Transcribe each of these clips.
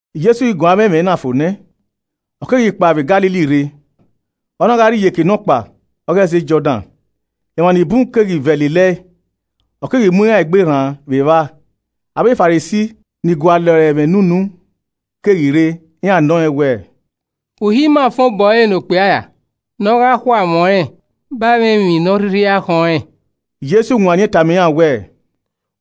Jesi ghi guan avbe ẹmwẹ na fo nẹ, ọ keghi kpao vbe Galili rre, ọ na gha rrie iyeke nọkpa ọghe ẹzẹ Jọdan. Emwa ni bun keghi vẹ lelẹe, ọ keghi mu iran egbe rran vbe evba. Avbe Farisi ni gualọ ẹre ẹmwẹ ne unu keghi rre, iran nọ rẹn wẹẹ, “Uhi ima fan obọ ẹre ne okpia ra ne ọ gha khu amwẹ ọnrẹn ba ẹmwẹ emwi ne ọ rhirhi khọn rẹn?” Jesu wanniẹn tama iran wẹẹ,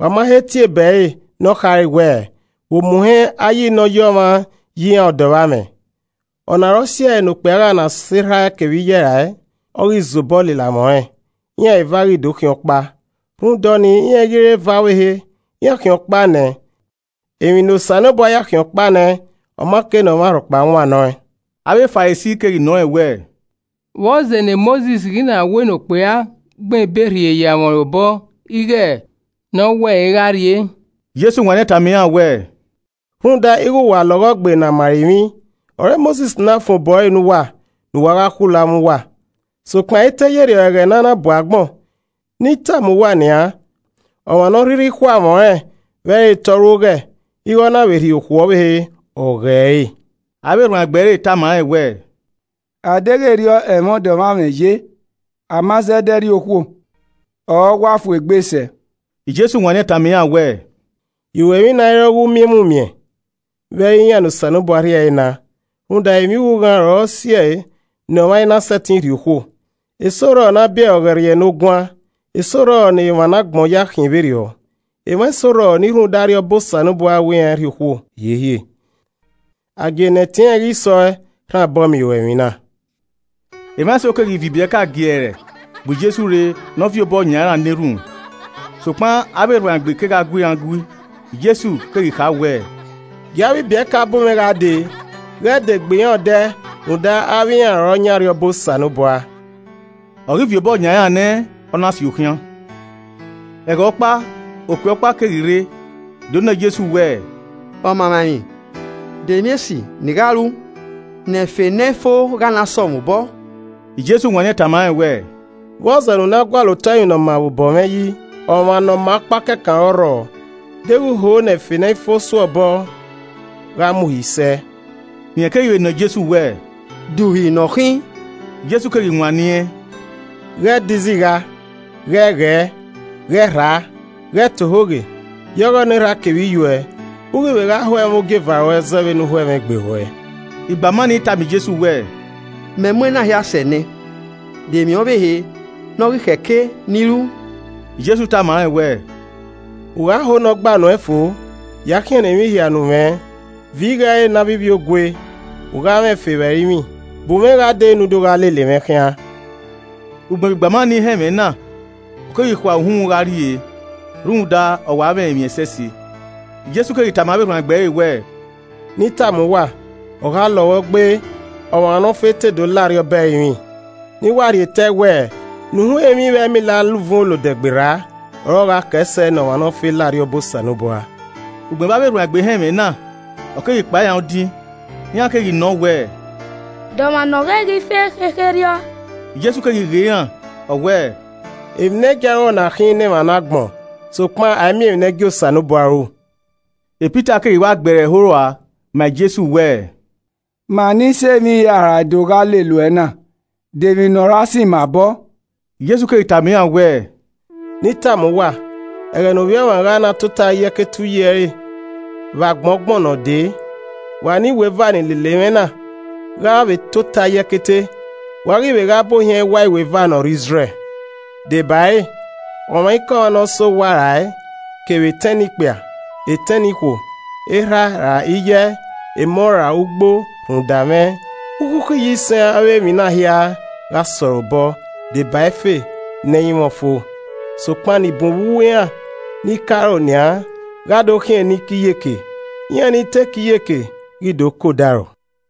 “Wa ma he tie ebe ẹre nọ kha re wẹẹ, ‘Vbe omuhẹn Ayi ne ọ yi ọmwa yi iran ọdọ vbe amwẹ. Ọna ọre ọ siẹ ne okpia gha na sẹ erha ẹe kevbe iye ẹe rae, ọ ghi zẹ obọ lele amwẹ ọnrẹn, iran eva ghi do khian ọkpa.’ Rhunmwuda ọnii, iran i ghi re eva ọvbehe, iran khian ọkpa nẹ. Emwi ne Osanobua ya khian ọkpa nẹ, ọ ma kei ne ọmwa rhọkpa wannọ ẹn.” Avbe Farisi keghi nọ rẹn wẹẹ, “Vbọzẹ ne Mosis ghi na wẹ ne okpia gbẹn ebe rhie ye amwẹ ọnrẹn obọ ighe rẹn khu ẹe, ne ọ we ẹre gha rrie?” Jesu wanniẹn tama iran wẹẹ, “Rhunmwuda ighe wa lọghọ gbe ne a ma ẹre emwi, ọre Mosis na fan obọ ẹre ne uwa, ne uwa gha khulo amwẹ uwa. Sokpan ẹ i te ye erriọ ẹghẹ ne a na bu agbọn. Ne I tama uwa nian, ọmwa ne ọ rhirhi khu amwẹ ọnrẹn vbe ẹ i re te ọ ru oghẹ, ighe ọ na vbe rhie okhuo ọvbehe, ọ ghẹ re.” Avbe erhuanegbe ẹre tama rẹn wẹẹ, “A deghẹ erriọ ẹmwẹ ọdọ vbe amwẹ ye, a ma zẹdẹ rhie okhuo ọre ọwa fu egbe sẹ.” Jesu wanniẹn tama iran wẹẹ, “Iruẹmwi na i re ọ ghe umiẹnmwumiẹn vbe ẹ i re iran ne Osanobua rhie ẹre na. Rhunmwuda emwi ughughan ọre ọ si ẹe ne ọmwa i na sẹtin rhie okhuo, eso rrọọ ne a biẹ ọre ọghẹrriẹnoguan, eso rrọọ ne emwa ne agbọn ya khian vberriọ, emwa eso rrọọ ni rhunmwuda Arriọba Osanobua wẹ iran i rhie okhuo hiehie. A gie ne ẹtin ẹnrẹn ghi sẹ ọ rhan obọ miẹn iruemwi na.” Emwa eso keghi viọ ibiẹka giẹrẹ bu Jesu rre ne ọ viọ obọ yan iran na erhunmwu. Sokpan avbe erhuanegbe kegha gu iran gui. Jesu keghi kha wẹẹ, “Gie avbe ibiẹka bu mwẹ gha dee, ghẹ de gbe iran odẹ rhunmwuda avbe iran orre ọ yan Arriọba Osanobua.” Ọ ghi viọ obọ yan iran nẹ, ọ na si okhian. Ẹghẹ ọkpa, okpia ọkpa keghi rre do nọ Jesu wẹẹ, “Ọmaemwaemwi, de emwi esi ne I gha ru ne ẹfe ne ẹ i fo gha na sẹ mwẹ obọ?” Jesu wanniẹn tama rẹn wẹẹ, “Vbọzẹ ne u na gualọ otọ emwi ne ọ maa vbe obọ mwẹ yi? Ọmwa Ne ọ maa ọkpa kẹkan ọre ọ rrọọ. Deghẹ u hoo ne ẹfe ne ẹ i fo sẹ uẹ obọ, gha mu uhi sẹ.” Rẹn keghi vbe nọ Jesu wẹẹ, “De uhi ne ọ khin?” Jesu keghi wanniẹn, “Ghẹ de izigha, ghẹ ghẹẹ, ghẹ rhaa, ghẹ ta ohoghe. Ya ọghọ ne erhaa kevbe iye uẹ, u ghi vbe gha ho ẹmwẹ ogieva ruẹ zẹ vbe ne u ho ẹmwẹ egbe ruẹ.” Igbama ni tama Jesu wẹẹ, “Mẹ mu ena hia sẹ nẹ. De emwi ọvbehe ne ọ ghi khẹ ke ne I ru?” Jesu tama rẹn wẹẹ, “U gha ho ne ọ gba nuẹn fo, ya khiẹnnẹ emwi hia ne u mwẹ, viọ igho ẹre ne avbe ivbiogue, u gha mwẹ ẹfe vbe ẹrinmwi, bu mwẹ gha dee ne u do gha lele mwẹ khian.” Ugbẹn vbe igbama nii họn ẹmwẹ na, ọ keghi khua uhunmwu gha rrie, rhunmwuda, ọ wa mwẹ emwi ẹsẹse. Jesu keghi tama avbe erhuanegbe ẹre wẹẹ, “Ne I tama uwa, ọ gha lọghọ gbe ọmwa ne ọ fe te do lao Arriọba ẹrinmwi. Ne I wa rhie tẹe wẹẹ, ne uhunmwu emwi vbe ẹmila la uvun olodẹ gberra ọre ọ gha kẹẹ sẹ ne ọmwa ne ọ fe la Arriọba Osanobua.” Ugbẹn vbe avbe erhuanegbe họn ẹmwẹ na, ọ keghi kpan iran odin. Iran keghi nọọn wẹẹ, “De ọmwa ne ọ ghẹ ghi fe khekherriọ?” Jesu keghi ghe iran, ọ wẹẹ, “Emwi ne ẹ i gia ru ọre ọna khin ne emwa ne agbọn sokpan a i miẹn emwi ne ẹ i gie Osanobua ru.” Pita keghi wa gbe ẹre ẹho rua ma Jesu wẹẹ, “Ma ni sẹ emwi hia rae do gha lele uẹ na, de emwi ne ọ ra sẹ ima obọ?” Jesu keghi tama iran wẹẹ, Ne I tama uwa, ẹghẹ ne Ovbi Ọmwa gha na tota ye ẹkete uyi ẹre vbe Agbọn Ọgbọn ne ọ dee, wa ne iweva ni lele mwẹ na, gha vbe tota ye ẹkete, wa ghi vbe gha bu ohiẹn ẹwae iweva ne ọ rre Izrẹl. Debare, ọmwaikọmwa ne ọ sẹ owa rae kevbe etẹn nikpia, etẹn nikhuo, erha ra iye, emọ ra ugbo rhunmwuda mwẹ, ukhukhu iyisẹn avbe emwi na hia gha sẹ ọre obọ deba ẹfe ne ẹ i mwẹ ọfo. Sokpan ni bun vbe uwu iran ni ke aro nian gha do khian ni ke iyeke, iran ni te ke iyeke ghi do ke odaro.